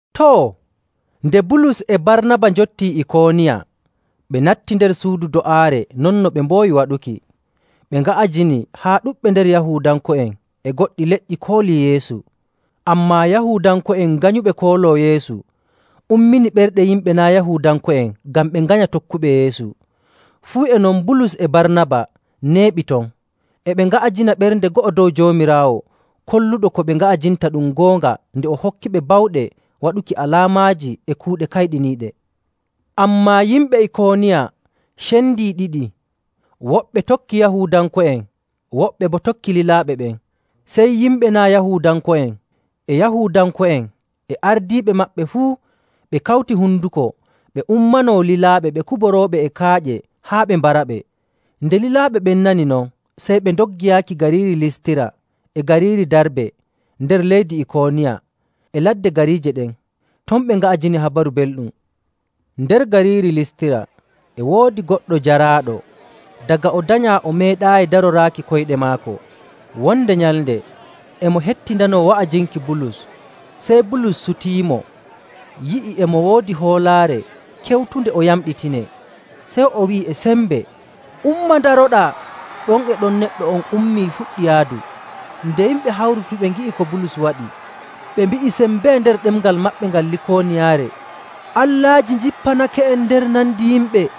Too, nde Bulus e Barnaba njottii Ikooniya, ɓe natti nder suudu do'aare non no ɓe mboowi waɗuki. Ɓe nga'ajini haa ɗuɗɓe nder Yahuudanko'en e goɗɗi leƴƴi koolii Yeesu. Ammaa Yahuudanko'en nganyuɓe kooloo Yeesu ummini ɓerɗe yimɓe naa' Yahuudanko'en ngam ɓe nganya tokkuɓe Yeesu. Fuu e non Bulus e Barnaba neeɓi ton, e ɓe nga'ajina ɓernde go'o dow Joomiraawo kolluɗo ko ɓe nga'ajinta ɗum goonga nde o hokkiɓe bawɗe waɗuki alaamaaji e kuuɗe kayɗiniiɗe. Ammaa yimɓe Ikooniya cendii ɗiɗi. Woɓɓe tokki Yahuudanko'en, woɓɓe boo tokki lilaaɓe ɓen. Sey yimɓe naa' Yahuudanko'en e Yahuudanko'en e ardiiɓe maɓɓe fuu ɓe kawti honduko ɓe ummanoo lilaaɓe ɓe kuborooɓe e kaaƴe haa ɓe mbaraɓe. Nde lilaaɓe ɓen nani non, sey ɓe ndoggi yaaki gariiri Listira e gariiri Darbe nder leydi Likooniya, e ladde gariije ɗen. Ton ɓe nga'ajini Habaru Belɗum. Nder gariiri Listira e woodi goɗɗo jaraaɗo. Daga o danyaa o meeɗaayi daroraaki koyɗe maako. Wonde nyalnde e mo hettindanoo wa'ajinki Bulus, sey Bulus sutiimo, yi'i e mo woodi hoolaare kewtunde o yamɗitinee. Sey o wi'i e sembe, “Umma ndaroɗaa!” Ɗon e ɗon neɗɗo on ummii: Waato sorti. fuɗɗi yaadu. Nde yimɓe hawrutuɓe ngi'i ko Bulus waɗi, ɓe mbi'i sembee nder ɗemngal maɓɓe ngal Likooniyaare, “Allaaji njippanake'en nder nandi yimɓe!”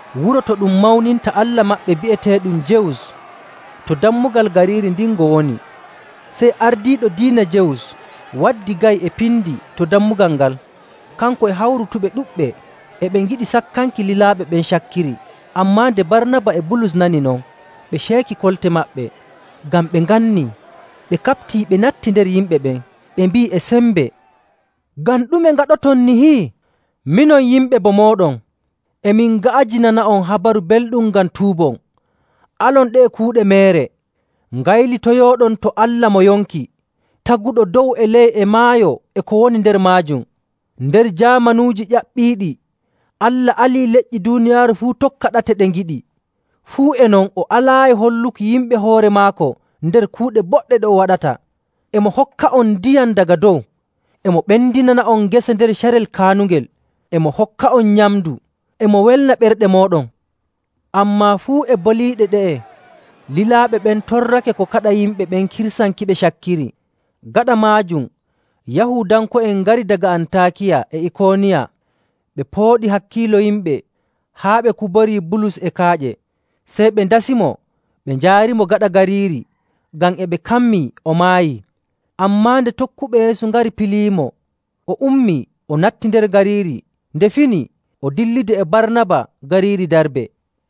Wuro to ɗum mawninta allah maɓɓe bi'eteeɗum Jeewus to dammugal gariiri ndin ngo woni. Sey ardiiɗo diina Jeewus waddi ga'i e pindi to dammugal ngal. Kanko e hawrutuɓe ɗuɗɓe e ɓe ngiɗi sakkanki lilaaɓe ɓen cakkiri. Ammaa nde Barnaba e Bulus nani non, ɓe ceeki kolte maɓɓe ngam ɓe ngannii. Ɓe kaɓtii ɓe natti nder yimɓe ɓen, ɓe mbi'i e sembe, “Ngam ɗume ngaɗoton nihi? Minon yimɓe bo mooɗon. E min nga'ajinana'on Habaru Belɗum ngam tuubon, alon ɗe'e kuuɗe meere, ngaylitoyooɗon to Allah mo yonki, Taguɗo dow e ley e maayo e ko woni nder maajum.. Nder jaamanuuji ƴaɓɓiiɗi Allah alii leƴƴi duuniyaaru fuu tokka ɗate ɗe ngiɗi. Fuu e non, o alaayi holluki yimɓe hoore maako nder kuuɗe boɗɗe ɗe o waɗata. E mo hokka'on ndiyam daga dow, e mo ɓendinana'on gese nder carel kaanungel, e mo hokka'on nyamndu, e mo welna ɓerɗe mooɗon.” Ammaa fuu e boliiɗe ɗe'e, lilaaɓe ɓen torrake ko kaɗa yimɓe ɓen hirsankiɓe cakkiri. Gaɗa maajum Yahuudanko'en ngari daga Antaakiya e Ikooniya. Ɓe pooɗi hakkiilo yimɓe, haa ɓe kuborii Bulus e kaaƴe. Sey ɓe ndasimo ɓe njaarimo gaɗa gariiri, ngam e ɓe kammii o maayii. Ammaa nde tokkuɓe Yeesu ngari piliimo, o ummii, o natti nder gariiri. Nde fini, o dillidi e Barnaba gariiri Darbe.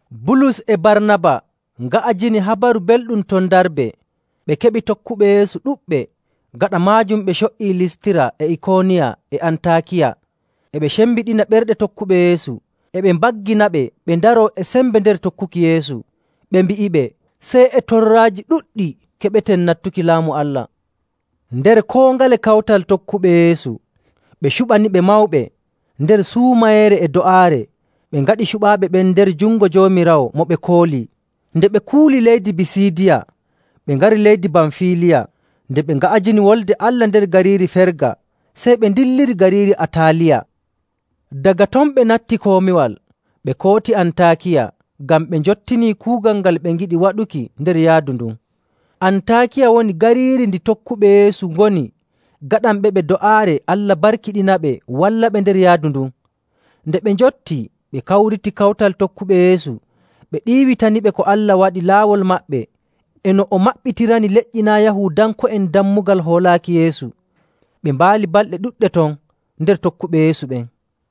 Bulus e Barnaba nga'ajini Habaru Belɗum ton Darbe, ɓe keɓi tokkuɓe Yeesu ɗuɗɓe. Gaɗa maajum ɓe co''ii Listira e Ikooniya e Antaakiya. E ɓe cembiɗina ɓerɗe tokkuɓe Yeesu, e ɓe mbagginaɓe ɓe ndaroo e sembe nder tokkuki Yeesu. Ɓe mbi'iɓe, “Sey e torraaji ɗuɗɗi keɓeten nattuki Laamu Allah.” Nder koo ngale kawtal tokkuɓe Yeesu, ɓe cuɓaniɓe mawɓe. Nder suumayeere e do'aare, ɓe ngaɗi cuɓaaɓe ɓen nder jungo Joomiraawo mo ɓe koolii. Nde ɓe kuuli leydi Bisiidiya, ɓe ngari leydi Bamfiiliya. Nde ɓe nga'ajini Wolde Allah nder gariiri Ferga, sey ɓe ndilliri gariiri Ataaliya. Daga ton ɓe natti komiwal, ɓe kooti Antaakiya, ngam ɓe njottinii kuugal ngal ɓe ngiɗi waɗuki nder yaadu ndun. Antaakiya woni gariiri ndi tokkuɓe Yeesu ngoni gaɗanɓeɓe do'aare Allah barkiɗinaɓe wallaɓe nder yaadu ndun. Nde ɓe njottii, ɓe kawriti kawtal tokkuɓe Yeesu, ɓe ɗiiwitaniɓe ko Allah waɗi laawol maɓɓe, e no o maɓɓitirani leƴƴi ɗi naa' Yahuudanko'en dammugal hoolaaki Yeesu. Ɓe mbaali balɗe ɗuɗɗe ton nder tokkuɓe Yeesu ɓen.